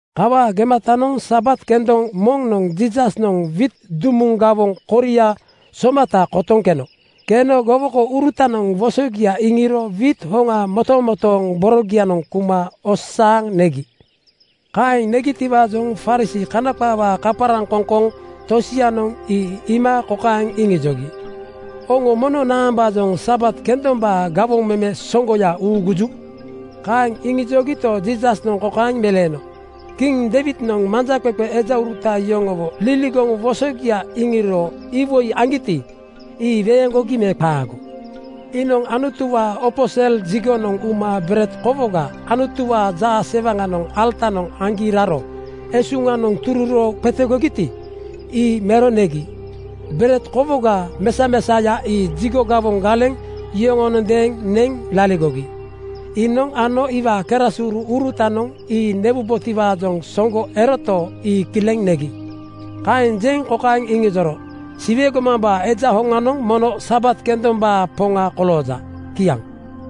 Kawaa gematanoŋ Sabat kendoŋ moŋnoŋ Jiisasnoŋ wiit dumuŋ gawoŋ koria somata kotoŋ keno. Keno gowokouru-tanoŋ wosogia iŋiro wiit hoŋa motomotooŋ borogianoŋ kuma osasaaŋ negi. Kaeŋ negitiwaajoŋ Farisii (Kana qaawaa kaparaŋ-koŋkoŋ) tosianoŋ ii iima kokaeŋ iŋijogi, “Oŋo mono naambaajoŋ Sabat kendombaa gawoŋ meme soŋgoya uuguju?” Kaeŋ iŋijogito, Jiisasnoŋ kokaeŋ meleeno, “Kiŋ Deiwidnoŋ manjaqeqe ejauruta yoŋowo liligoŋ wosogia iŋiro iwoi aŋgiti, ii weeŋgogi me qaago? Iinoŋ Anutuwaa opo sel jigonoŋ uma bered kowoga Anutuwaa jaasewaŋanoŋ alatanoŋ aŋgi raro esuŋanoŋ tururo qetegogiti, ii mero negi. Bered kowoga mesamesaoya ii jigo gawoŋ galeŋ yoŋonondeeŋ neŋ laligogi. Iinoŋ ano iwaa kerasuru-urutanoŋ ii newubotiwaajoŋ soŋgo eroto, ii kileŋ negi.” Kaeŋ jeŋ kokaeŋ iŋijoro, “Siwe gomambaa Eja hoŋanoŋ mono Sabat kendombaa Poŋa kolooja.” Kiaŋ.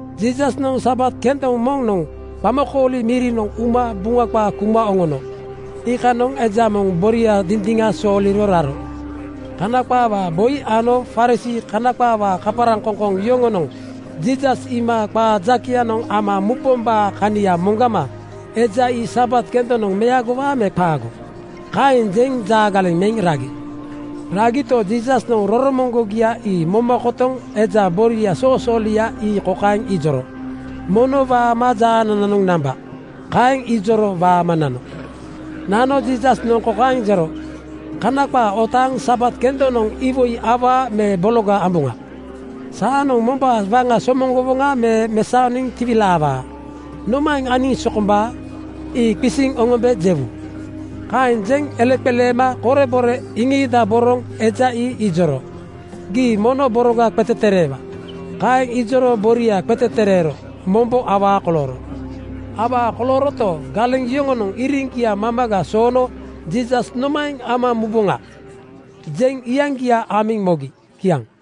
Jiisasnoŋ Sabat kendoŋ moŋnoŋ qamakooli mirinoŋ uma Buŋa qaa kuma oŋono. Iikanoŋ eja moŋ boria dindiŋa sooliro raro. Kana qaawaa boi ano Farisii (Kana qaawaa kaparaŋkoŋkoŋ) yoŋonoŋ Jiisas iima qaa jakeyanoŋ ama mubombaa kania moŋgama “Eja ii Sabat kendonoŋ meagowaa me qaago?” kaeŋ jeŋ jaa galeŋ meŋ ragi. Ragito, Jiisasnoŋ roromoŋgogia ii moma kotoŋ eja boria soosoolia ii kokaeŋ ijoro, “Mono waama jaanananoŋ namba.” Kaeŋ ijoro waama nano. Nano Jiisasnoŋ kaeŋ jero, “Kana qaa otaaŋ Sabat kendonoŋ iwoi awaa me bologa amboŋa? Saanoŋ mombaa waŋa somoŋ-gowoŋa me mesaoniŋ tiwilaawaa. Nomaeŋ aniŋ sokombaa? Ii qisiŋ oŋombe jewu.” Kaeŋ jeŋ eleqeleema korebore iŋiidaboroŋ eja ii ijoro, “Gii mono boroga qetetereewa.” Kaeŋ ijoro boria qetetereero mombo awaa kolooro. Awaa kolooroto, galeŋ yoŋonoŋ iriŋgia mamaga soono “Jiisas nomaeŋ ama muboŋa?” jeŋ iyaŋgia amiŋ mogi. Kiaŋ.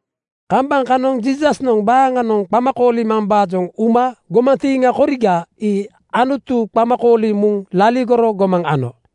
Kambaŋ kanoŋ Jiisasnoŋ baaŋanoŋ qama koolimambaajoŋ uma gomantiiŋa koriga ii Anutu qama kooliŋ muŋ laligoro gomaŋ ano.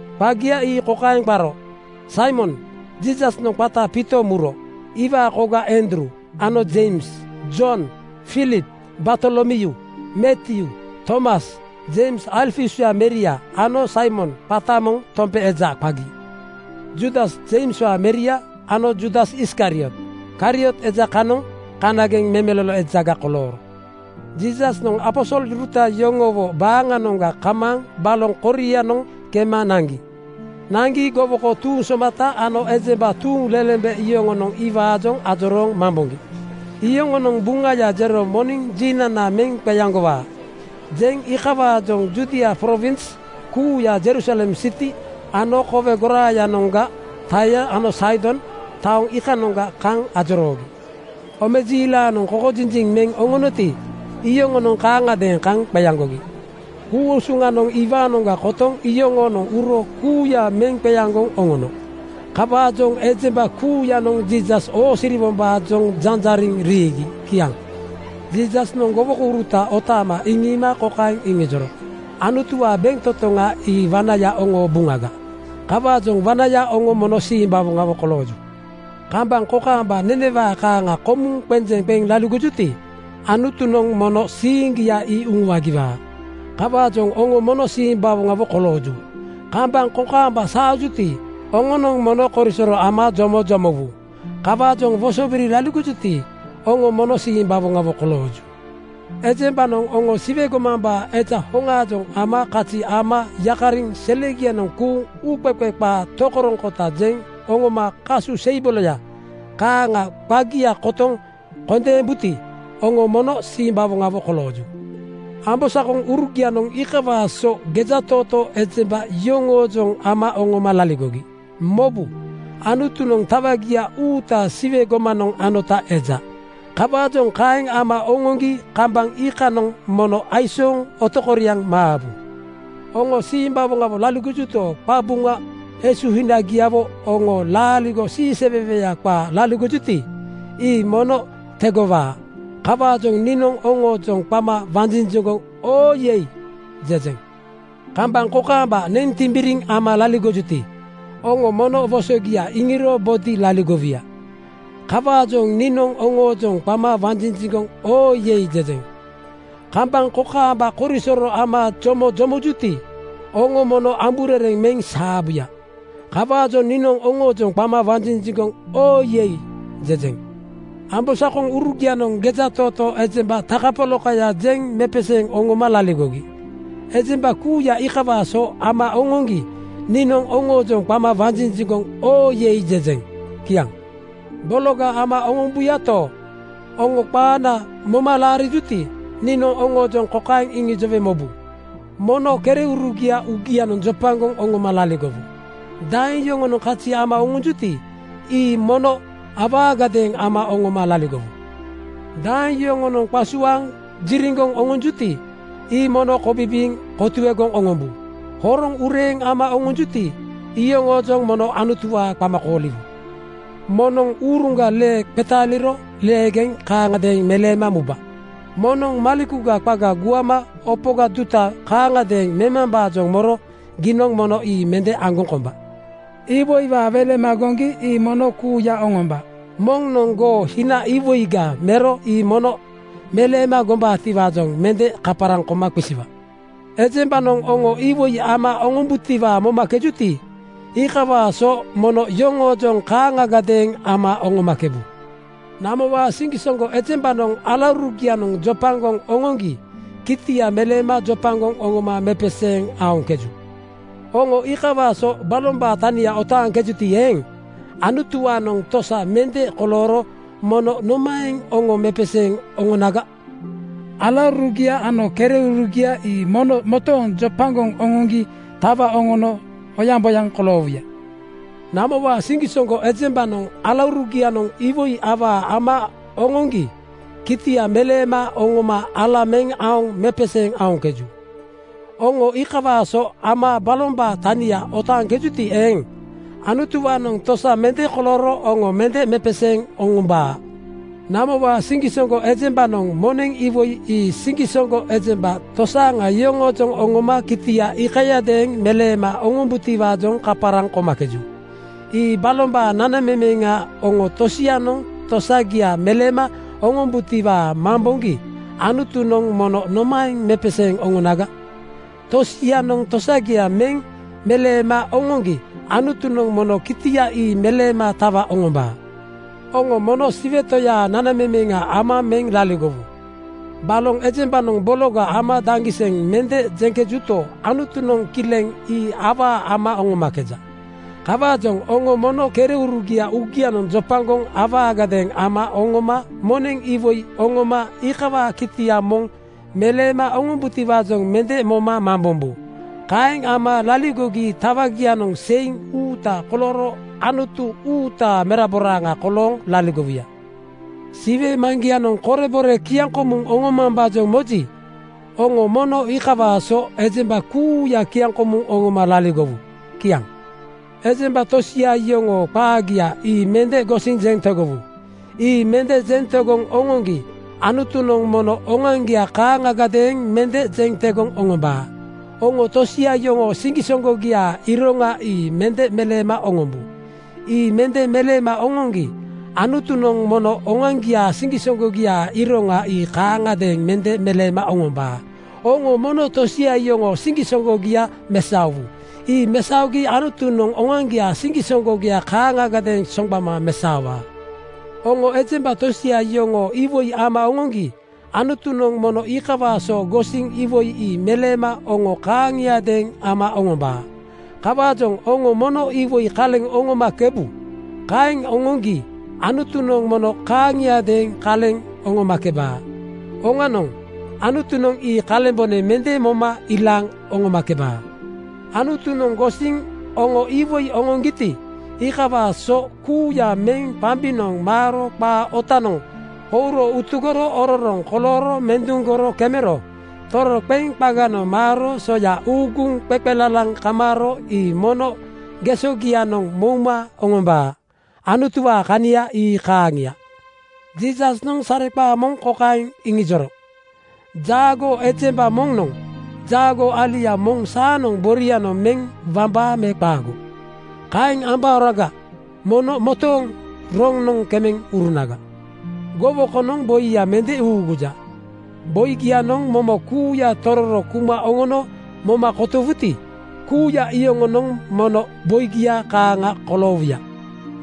Qagia ii kokaeŋ qaro: Saimon, Jiisasnoŋ qata Piito muro, iwaa koga Andruu ano Jeims, Jon, Filip, Bartolomyuu, Matyuu, Tomas, Jeims Alfiuswaa meria ano Saimon qata moŋ Tompe eja qagi. Juudas Jeimswaa meria ano Juudas Iskariot. Kariot eja kanoŋ kanageŋ memelolo ejaga kolooro. Jiisasnoŋ aposoluruta yoŋowo baaŋanoŋga kamaaŋ baloŋ korianoŋ kema naŋgi. Naŋgi gowoko tuuŋ somata ano ejemba tuuŋlelembe yoŋonoŋ iwaajoŋ ajorooŋ mamboŋgi. Yoŋonoŋ “Buŋaya jero moniŋ jinana meŋ qeaŋgowaa,” jeŋ iikawaajoŋ Judia prowins kuuya, Jerusalem siti ano kowe goraayanoŋga Taia ano Saidon taoŋ iikanoŋa kaŋ ajoroogi. Omejiilanoŋ kokojinjiŋ meŋ oŋonoti, iyoŋonoŋ kaaŋagadeeŋ kaŋ qeaŋgogi. Ku-usuŋanoŋ iwaanoŋga kotoŋ yoŋoonoŋ uro kuuya meŋ qeaŋgoŋ oŋono. Kawaajoŋ ejemba kuuyanoŋ Jiisas oosiriwombaajoŋ janjariŋ riigi. Kiaŋ. Jiisasnoŋ gowokouruta otaama iŋiima kokaeŋ iŋijoro, “Anutuwaa bentotoŋ ii wanaya oŋoo buŋaga. Kawaajoŋ wanaya oŋo mono simbawoŋawo kolooju. Kambaŋ kokaamba nenewaa kaaŋa komuŋ qenjeŋ qeŋ laligojuti, Anutunoŋ mono siiŋgia ii uŋuagiwaa. Kawaajoŋ oŋo mono simbawoŋawo kolooju. Kambaŋ kokaamba saajuti, oŋonoŋ mono korisoro ama jomo jomowu. Kawaajoŋ wosobiri laligojuti, oŋo mono simbawoŋawo kolooju. “Ejembanoŋ oŋo Siwe gomambaa Eja hoŋaajoŋ ama kazi ama yakariŋ selianoŋ kuuŋ uuqeqe qaa tokoroŋkota jeŋ oŋoma kasu seibolo kaaŋa qagia kotoŋ kondeembuti, oŋo mono simbawoŋawo kolooju. Ambosakoŋurugianoŋ iikawaa so gejatootoo ejemba yoŋoojoŋ ama oŋoma laligogi. Mobu! Anutunoŋ tawagia uuta Siwe gomanoŋ anota eja. Kawaajoŋ kaeŋ ama oŋoŋgi kambaŋ iikanoŋ mono aisooŋ otokoriaŋ maabu. Oŋo simbawoŋawo laligojuto, qabuŋa esuhinagiawo oŋo laaligo siiseweweya qaa laligojuti, ii mono tegowaa. Kawaajoŋ niinoŋ oŋoojoŋ qama wanjinjiŋgoŋ ‘Oo yei!’ jejeŋ. Kambaŋ kokaamba neŋ timbiriŋ ama laligojuti, oŋo mono wosogia iŋiro bodi laligowuya. Kawaajoŋ niinoŋ oŋoojoŋ qama wanjinjiŋgoŋ ‘Oo yei!’ jejeŋ. Kambaŋ kokaamba korisoro ama jomo jomojuti, oŋo mono amburereŋ meŋ saabuya. Kawaajoŋ niinoŋ oŋoojoŋ qama wanjinjiŋgoŋ ‘Oo yei!’ jejeŋ. “Ambosakoŋurugianoŋ gejatootoo ejemba takapolakaya jeŋ mepeseeŋ oŋoma laligogi. Ejemba kuuya iikawaa so ama oŋoŋgi niinoŋ oŋoojoŋ qama wanjinjiŋgoŋ ‘Oo yei!’ jejeŋ.” Kiaŋ. “Bologa ama oŋombuyato, oŋo qaana moma laligojuti, niinoŋ oŋoojoŋ kokaeŋ iŋijowe mobu: Mono kereurugia uugianoŋ jopagoŋ oŋoma laligowu. Daeŋ yoŋonoŋ kazi ama oŋonjuti, ii mono awaagadeeŋ ama oŋoma laligowu. “Daeŋ yoŋonoŋ qasuaaŋ jiriŋgoŋ oŋonjuti, ii mono kobibiiŋ kotuegoŋ oŋombu. Horoŋ ureeŋ ama oŋonjuti, iyoŋoojoŋ mono Anutuwaa qama kooliwu. “Moŋnoŋ uruŋga lee qetaaliro leegeŋ kaaŋagadeeŋ meleema muba. Moŋnoŋ malekuga qaga guama opoga duta kaaŋgadeeŋ memambaajoŋ moro giinoŋ mono ii mende aŋgoŋ komba. “Iwoiwaa welema goŋgi ii mono kuuya oŋomba. Moŋnoŋ goo hina iwoiga mero ii mono meleema gombaatiwaajoŋ mende kaparaŋ koma qisiwa. Ejembanoŋ oŋo iwoi ama oŋombutiwaa momakejuti, iikawaa so mono yoŋoojoŋ kaaŋagadeeŋ ama oŋomakebu. “Namowaa siŋgisoŋgo ejembanoŋ alaurugianoŋ jopagoŋ oŋoŋgi kitia meleema jopagoŋ oŋoma mepeseeŋ aoŋkeju. Oŋo iikawaa so balombaa tania otaaŋkejuti eeŋ, Anutuwaanoŋ tosa mende kolooro mono nomaeŋ oŋo mepeseeŋ oŋonaga? Alaurugia ano kereurugia ii mono motooŋ jopagoŋ oŋoŋgi tawa oŋono oyaŋboyaŋ koloowuya. “Namowaa siŋgisoŋgo ejembanoŋ alaurugianoŋ iwoi awaa ama oŋoŋgi kitia meleema oŋoma ala meŋ aoŋ mepeseeŋ aoŋkeju. Oŋo iikawaa so ama balombaa tania otaaŋkejuti eeŋ, Anutuwaanoŋ tosa mende kolooro oŋo mende mepeseeŋ oŋombaa. “Namowaa siŋgisoŋgo ejembanoŋ moneŋ iwoi ii siŋgisoŋgo ejemba tosaaŋa yoŋoojoŋ oŋoma kitia iikayadeeŋ meleema oŋombutiwaajoŋ kaparaŋ komakeju. Ii balombaa nanamemeŋa. Oŋo tosianoŋ tosagia meleema oŋombutiwaa mamboŋgi Anutunoŋ mono nomaeŋ mepeseeŋ oŋonaga? Tosianoŋ tosagia mende meleema oŋoŋgi Anutunoŋ mono kitia ii meleema tawa oŋombaa. “Oŋo mono Siwe Toyaa nanamemeŋa ama meŋ laligowu. Baloŋ ejembanoŋ bologa ama daŋgiseŋ mende jeŋkejuto, Anutunoŋ kileŋ ii awaa ama oŋomakeja. Kawaajoŋ oŋo mono kereurugia uugianoŋ jopagoŋ awaagadeeŋ ama oŋoma moneŋ iwoi oŋoma iikawaa kitia moŋ meleema oŋombutiwaajoŋ mende moma mambombu. Kaeŋ ama laligogi tawagianoŋ seiŋ uuta kolooro Anutu uutaa meraboraaŋa kolooŋ laligowuya. “Siwe Maŋgianoŋ korebore kiaŋkomuŋ oŋomambaajoŋ moji, oŋo mono iikawaa so ejemba kuuya kiaŋkomuŋ oŋoma laligowu.” Kiaŋ. “Ejemba tosia yoŋoo qaagia ii mende gosiŋ jeŋ tegowu. Ii mende jeŋ tegoŋ oŋoŋgi Anutunoŋ mono oŋoaŋgia kaaŋagadeeŋ mende jeŋ tegoŋ oŋombaa. Oŋo tosia yoŋoo siŋgisoŋgogiaa iroŋa ii mende meleema oŋombu. Ii mende meleema oŋoŋgi Anutunoŋ mono oŋoaŋgiaa siŋgisoŋgogiaa iroŋa ii kaaŋagadeeŋ mende meleema oŋombaa. Oŋo mono tosia yoŋoo siŋgisoŋgogia mesaowu. Ii mesaogi Anutunoŋ oŋoaŋgiaa siŋgisoŋgogia kaaŋagadeeŋ soŋgbama mesaowaa. “Oŋo ejemba tosia yoŋoo iwoi ama oŋoŋgi Anutunoŋ mono iikawaa so gosiŋ iwoi ii meleema oŋo kaaŋiadeeŋ ama oŋombaa. Kawaajoŋ oŋo mono iwoi kaleŋ oŋomakebu. Kaeŋ oŋoŋgi Anutunoŋ mono kaaŋiadeeŋ kaleŋ oŋomakebaa. Oŋanoŋ, Anutunoŋ ii kalembone mende moma ilaaŋ oŋomakebaa. Anutunoŋ gosiŋ oŋo iwoi oŋoŋgiti, iikawaa soya kuuya meŋ qambinoŋ maaro qaa ootanoŋ kouro utugoro ororoŋ kolooro menduŋgoro kemero toroqeŋ qaganoŋ maaro soya uuguŋ qeqelalaŋ kamaaro ii mono gesogianoŋ mouma oŋombaa.” Anutuwaa kania ii kaaŋia. Jiisasnoŋ sareqaa moŋ kokaeŋ iŋijoro, “Jaagoo ejemba moŋnoŋ jaagoo alia moŋ saanoŋ borianoŋ meŋ wambaa me qaago? Kaeŋ kembaoraga mono motooŋ roŋnoŋ kemeŋ urunaga. Gowokonoŋ boiya mende uuguja. Boigianoŋ momo kuuya tororo kuma oŋono moma komuwuti, kuuya iyoŋonoŋ mono boigia kaaŋa koloowuya.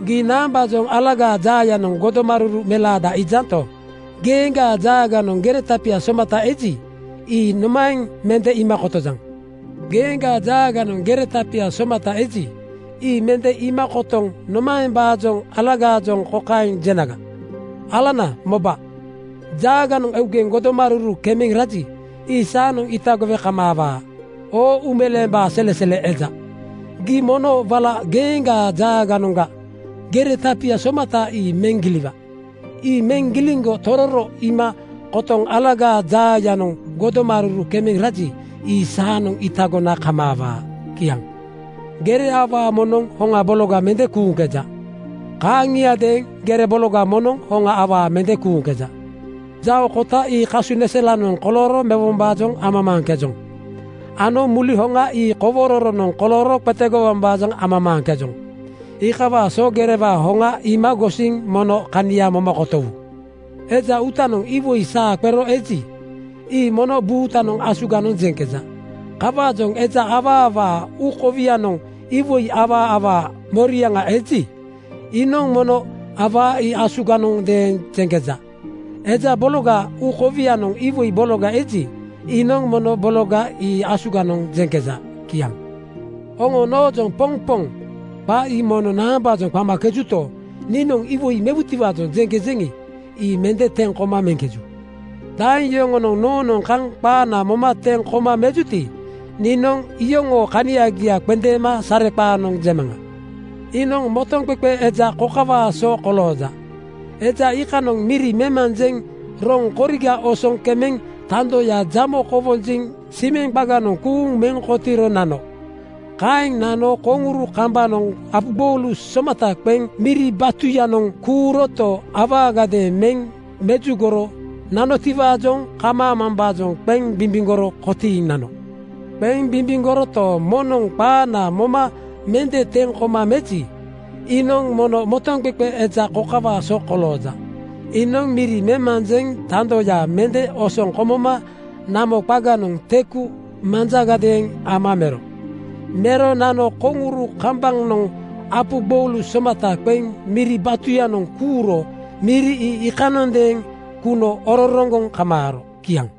“Gii naambaajoŋ alagaa jaayanoŋ godomaruru melaada iijanto, geeŋgaa jaaganoŋ gere tapia somata eji, ii nomaeŋ mende iima kotojaŋ? Geeŋgaa jaaganoŋ gere tapia somata eji, ii mende iima kotoŋ nomaembaajoŋ alagaajoŋ kokaeŋ jenaga, ‘Alana moba! Jaaganoŋ eugeŋ godomaruru kemeŋ raji, ii saanoŋ itagowe kamaawaa.’ Oo uumeleembaa selesele eja, gii mono wala geeŋgaa jaaganoŋga gere tapia somata ii meŋ giliwa. Ii meŋ giliŋgo tororo iima kotoŋ alagaa jaayanoŋ godomaruru kemeŋ raji, ii saanoŋ itagona kamaawaa.” Kiaŋ. “Gere awaa moŋnoŋ hoŋa bologa mende kuuŋkeja. Kaaŋiadeeŋ gere bologa moŋnoŋ hoŋa awaa mende kuuŋkeja. Jao kota ii kasuneselanoŋ kolooro mewombaajoŋ amamaaŋkejoŋ ano muli hoŋa ii kowororonoŋ kolooro qetegowombaajoŋ amamaaŋkejoŋ. Iikawaa so gerewaa hoŋa iima gosiŋ mono kania moma kotowu. “Eja uutanoŋ iwoi saa qero eji, ii mono buutanoŋ asuganoŋ jeŋkeja. Kawaajoŋ eja awaawaa uu kowianoŋ iwoi awaawaa moriaŋa eji, iinoŋ mono awaa ii asuganondeeŋ jeŋkeja. Eja bologaa uu kowianoŋ iwoi bologa eji, iinoŋ mono bologa ii asuganoŋ jeŋkeja.” Kiaŋ. “Oŋo noojoŋ ‘Poŋ Poŋ!’ qa ii mono naambaajoŋ qamakejuto, niinoŋ iwoi mewutiwaajoŋ jeŋkejeŋi, ii mende teŋ koma meŋkeju. “Daeŋ yoŋonoŋ noonoŋ kaŋ qaana moma teŋ koma mejuti, niinoŋ iyoŋoo kaniagia qendeema sareqaanoŋ jemaŋa. Iinoŋ motoŋqeqe eja kokawaa so kolooja: Eja iikanoŋ miri memanjeŋ roŋ koriga osoŋ kemeŋ tandoya jamo kowonjiŋ (simeŋ) qaganoŋ kuuŋ meŋ kotiiro nano. Kaeŋ nano koŋuru kambanoŋ apu gboulu somata qeŋ miri batuyanoŋ kuuroto, awaagadeeŋ meŋ mejugoro nanotiwaajoŋ kumambaajoŋ qeŋ bimbimgoro kotiiŋ nano. Qeŋ bimbimgoroto, moŋnoŋ qaana moma mende teŋ koma meji, iinoŋ mono motoŋqeqe eja kokawaa so kolooja: Iinoŋ miri memanjeŋ tandoya mende osoŋ komoma namo qaganoŋ teku manjagadeeŋ ama mero. Mero nano koŋuru kambanoŋ apu gboulu somata qeŋ miri batuyanoŋ kuuro miri ii iikanondeeŋ kuno ororoŋgoŋ kamaaro.” Kiaŋ.